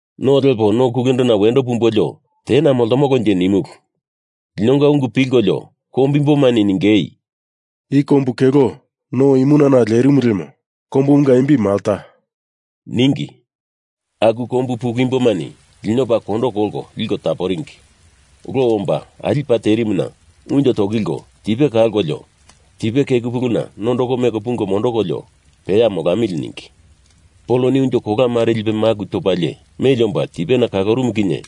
No lepo no kulendona wendo pumbolio tena moltomolonje nimulu. Linonga ungu pilkolio kombu imbomani ningei, “I kombu kelo no imunana lerimu lemo kombumunga imbimu Malta,” ningi. Aku kombu pulu imbomani lino paa kondo kolko liko taporingi. Lo omba ali paa terimuna unjo tokilko tipe kalkolio tipe keku puluna nondoko meko pungo mondokolio peya molamili ningi. Poloni unjo kola mare lipe maku topalie meli omba tipena kalorumu kinye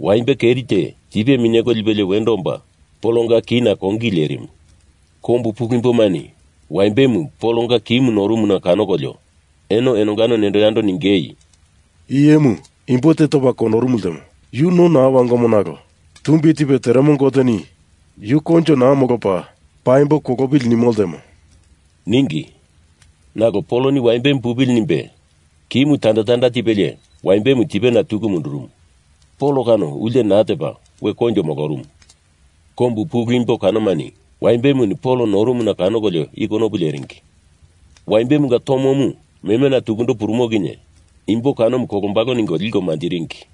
waimbe keri te tipe minyeko pilipelie wendo omba Polonga kina kongili lerimu. Kombu pulu imbomani waimbemu Polonga kimu norumuna kanokolio eno enongano nendo yando ningei, “I iyemu imbo te topa kondorumu ltemo. Yu no naa wangomo nalo Tumbi Tipe Teremo Goteni yu koinjo naa molopa, paimbo kolopili nimo ltemo,” ningi. Nalo Poloni waimbemu pupili nimbe kimu tanda tanda tipelie waimbemu tipena tuku mundurumu. Pol kano ulte naa topa we koinjo molorumu. Kombu pulu imbo kanomani waimbemuni Pol noromuna kanokolio i konopu leringi. Waimbemunga tomomu memena tukundo purumo kinye imbo kanomu kolombalo ningo liko manjiringi.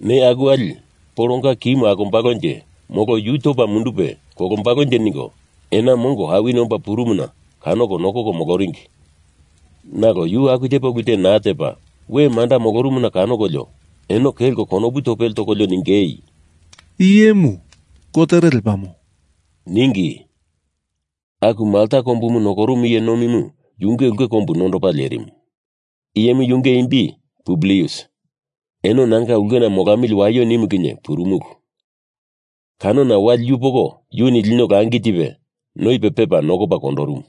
Neya aku wali, Polonga kimu akombalonje molo yu topa mundupe kolombalonje ningo ena mongo awini omba purumuna kanoko nokoko moloringi, nalo yu aku tepa ulu te naa tepa, we manda molorumuna kanokolio eno kelko konopu topele tokolio ningeindo, “I iyemu gotere lepamo,” ningi. Aku Malta kombumu nokorumu iye nomimu yunge ulke kombu nondopa lerimu. Iyemu yunge imbi Publius. Eno nanga ulkena molamili waio nimu kinye purumulu. Kanona, wali yupoko yuni lino langi tipe noipe pepa nokopa kondorumu.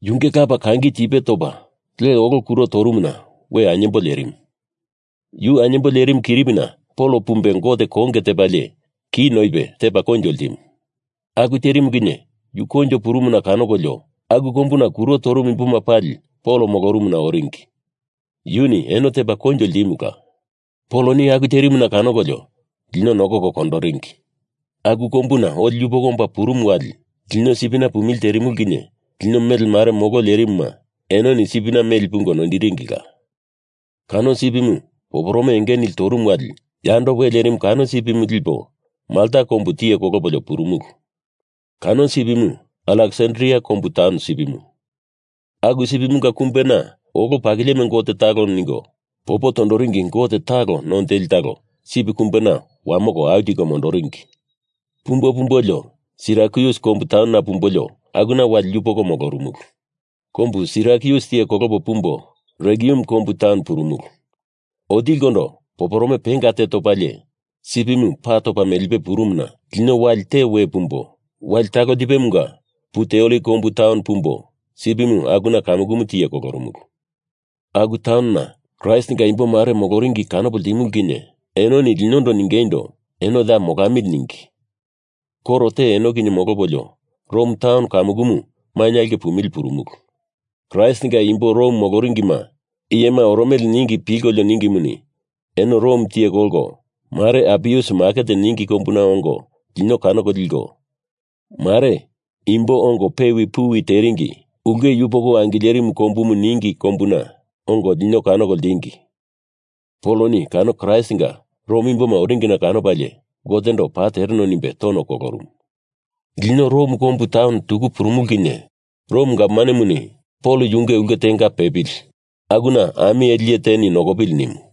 Yunge lapa kangi tipe topa le olo kuro torumuna we ainyembo lerimu. Yu ainyembo lerimu kiripina Pol pumbe Gote konge tepalie ki noipe tepa koinjo ltimu. Aku terimu kinye yu koinjo purumuna kanokolio aku kombuna kuro torumu imboma pali Pol molorumuna oringi. Yuni eno tepa koinjo ltimula. Poloni aku terimuna kanokolio lino nokoko kondoringi. Aku kombuna oli yupoko omba purumu wali, lino sipina pumili terimulu kinye lino mele mare molo lerimuma enoni sipina meli pungo noindiringila. Kano sipimu poporome enge nili torumu wali yando we lerimu kano sipimu lipo Molta kombu tiye kolopolio purumulu. Kano sipimu Aleksandria kombu taun sipimu. Aku sipimunga kumbena olo pakilieme gote talo ningo popo toringi gote talo none teli talo sip kumbena wamoko au tiko mondoringi. Pumbo pumbolio Sirakyus kombu taunona pumbolio akuna wali yupoko molorumulu. Kombu Sirakyus tiye kolopo pumbo Regium kombu taun purumulu. Otilikondo poporome penga te topalie sipimu pa topa melipe purumuna lino wali te we pumbo, wali talo tipemunga Puteoli kombu taun pumbo sipimu akuna kamukumu tiye kolorumulu. Aku taunona Kraistinga imbo mare moloringi kanopo ltimulu kinye enoni linondo ningeindo eno ya molamili ningi. Koro te eno kinye molopolio Rom taun kamukumu mainye aulke pumili purumulu. Kraistinga imbo Rom moloringima iyema oromele ningi pilkolio ningimuni eno Rom tiye kolko, mare Apius maket ningi kombuna ongo lino kanoko liko, mare Imbo Ongo Pewi Puwi Teringi Ulke Yupoko Angilerimu Kombumu ningi kombuna ongo lino kanoko ltingi. Poloni kano Kraistinga Rom imboma oringina kanopalie Gotendo paa tereno nimbe tono kolorumu. Lino Rom kombu taun tuku purumulu kinye Rom gavmanemuni Pol yunge ulke tenga pepili akuna ami ele iye teni nokopili nimu.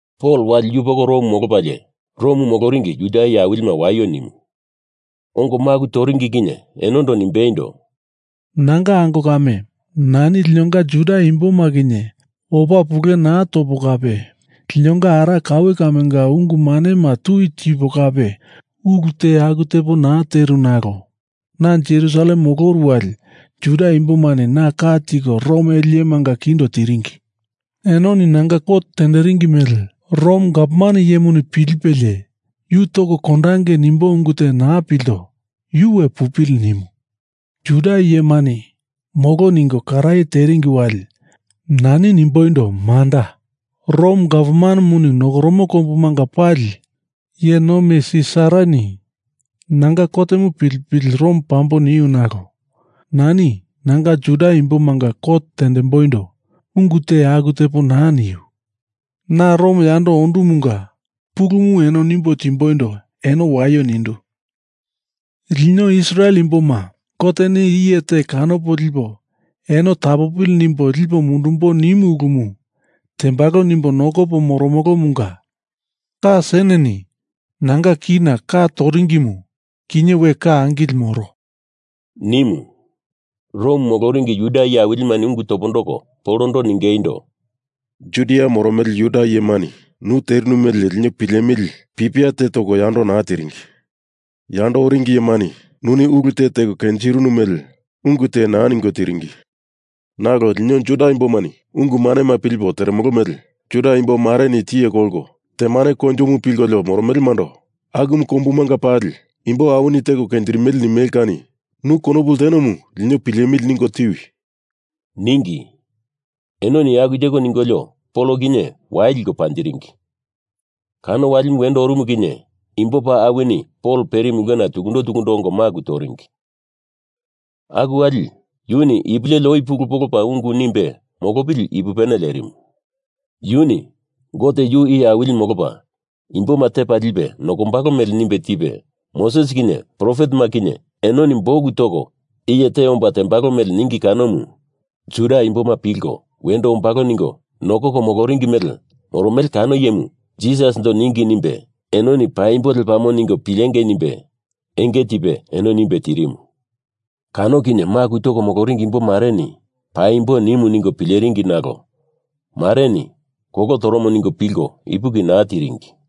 Pol wali yupoko Rom molopalie Rom moloringi Juda iye awilima waio nimu. Ongo maku toringi kinye enondo nimbeindo, “Nanga ango kame, nani linonga Juda imboma kinye opa pule naa topo kape linonga ara kaue kamenga ungu manema tui tipo kape ulu te aku tepo naa teru nalo na Jerusalem moloru wali Juda imbomani na ka tiko Rom ele iyemanga kindo tiringi. Enoni nanga kot tenderingi mele Rom gavman iyemuni pilipelie yu toko kondange nimbo ungu te naa pilto, yu we pupili nimu. Juda iyemani molo ningo karaye teringi wali nani nimboindo manda, Rom gavmanemuni nokoromo kombumanga pali iye nomi Sisarani nanga kotemu pilipili, Rom pambo niu nalo nani nanga Juda imbomanga kot tendemboindo ungu te aku tepo naa niu. Na Rom yando ondumunga pulumu eno nimbo timboindo eno waio nindu. Lino Israel imboma Goteni iye te kanopo lipo eno tapopili nimbo lipo mundumbo nimu ulumu tembalo nimbo nokopo moromolomunga ka seneni nanga kina ka toringimu kinye we ka angili moro,” nimu. Rom moloringi Juda iye awilimani ungu topondoko Polondo ningeindo, “Judia moromele Juda iyemani nu terinu mele lino pilemili pipia te toko yando naa tiringi. Yando oringi iyemani nuni ulu te teko kenjirinu mele ungu te naa ningo tiringi. Nalo lino Juda imbomani ungu manema pilipo teremolo mele Juda imbo mareni tiye kolko temane koinjomu pilkolio moromelemando akumu kombumanga pali imbo awini teko kenjirimele nimele kani nu konopu ltenomu lino pilemili ningo tiwi,” ningi. Enoni aku teko ningolio Pol kinye wai liko panjiringi. Kano walimu wendo orumu kinye imbo paa awini Pol perimu ulkena tukundo tukundo ongo maku toringi. Aku wali yuni ipu leli oi pulu polopa ungu nimbe molopili ipupene lerimu. Yuni Gote yu Iye Awili molopa imboma tepa lipe nokombalo mele nimbe tipe Moses kinye profetema kinye enoni buk toko iye te omba tembalo mele ningi kanomu Juda imboma pilko wendo ombalo ningo nokoko moloringi mele moromele kano iyemu Jisasindo ningi nimbe enoni paimbo lepamo ningo pilengei nimbe enge tipe eno nimbe tirimu. Kano kinye maku toko moloringi imbo mareni Paimbo nimu ningo pileringi nalo mareni kolo toromo ningo pilko ipuki naa tiringi.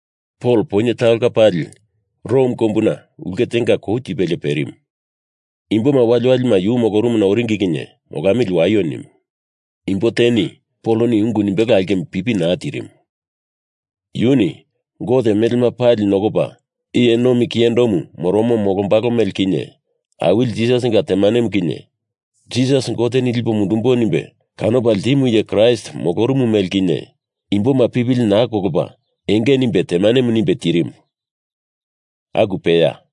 Pol poinye talonga pali Rom kombuna ulke tenga kou tipelie perimu. Imboma waliwalima yu molorumuna oringi kinye molamili waio nimu. Imbo teni Poloni ungu nimbelo aulkemu pipi naa tiringi. Yuni Gote melema pali nokopa iye nomi kiyendomu moromo molombalo mele kinye Awili Jisasinga temanemu kinye Jisas Goteni lipo mundumbo nimbe kanopa ltimu iye Kraist molorumu mele kinye imboma pipili naa kolopa enge nimbe temanemu nimbe tirimu. Aku peya.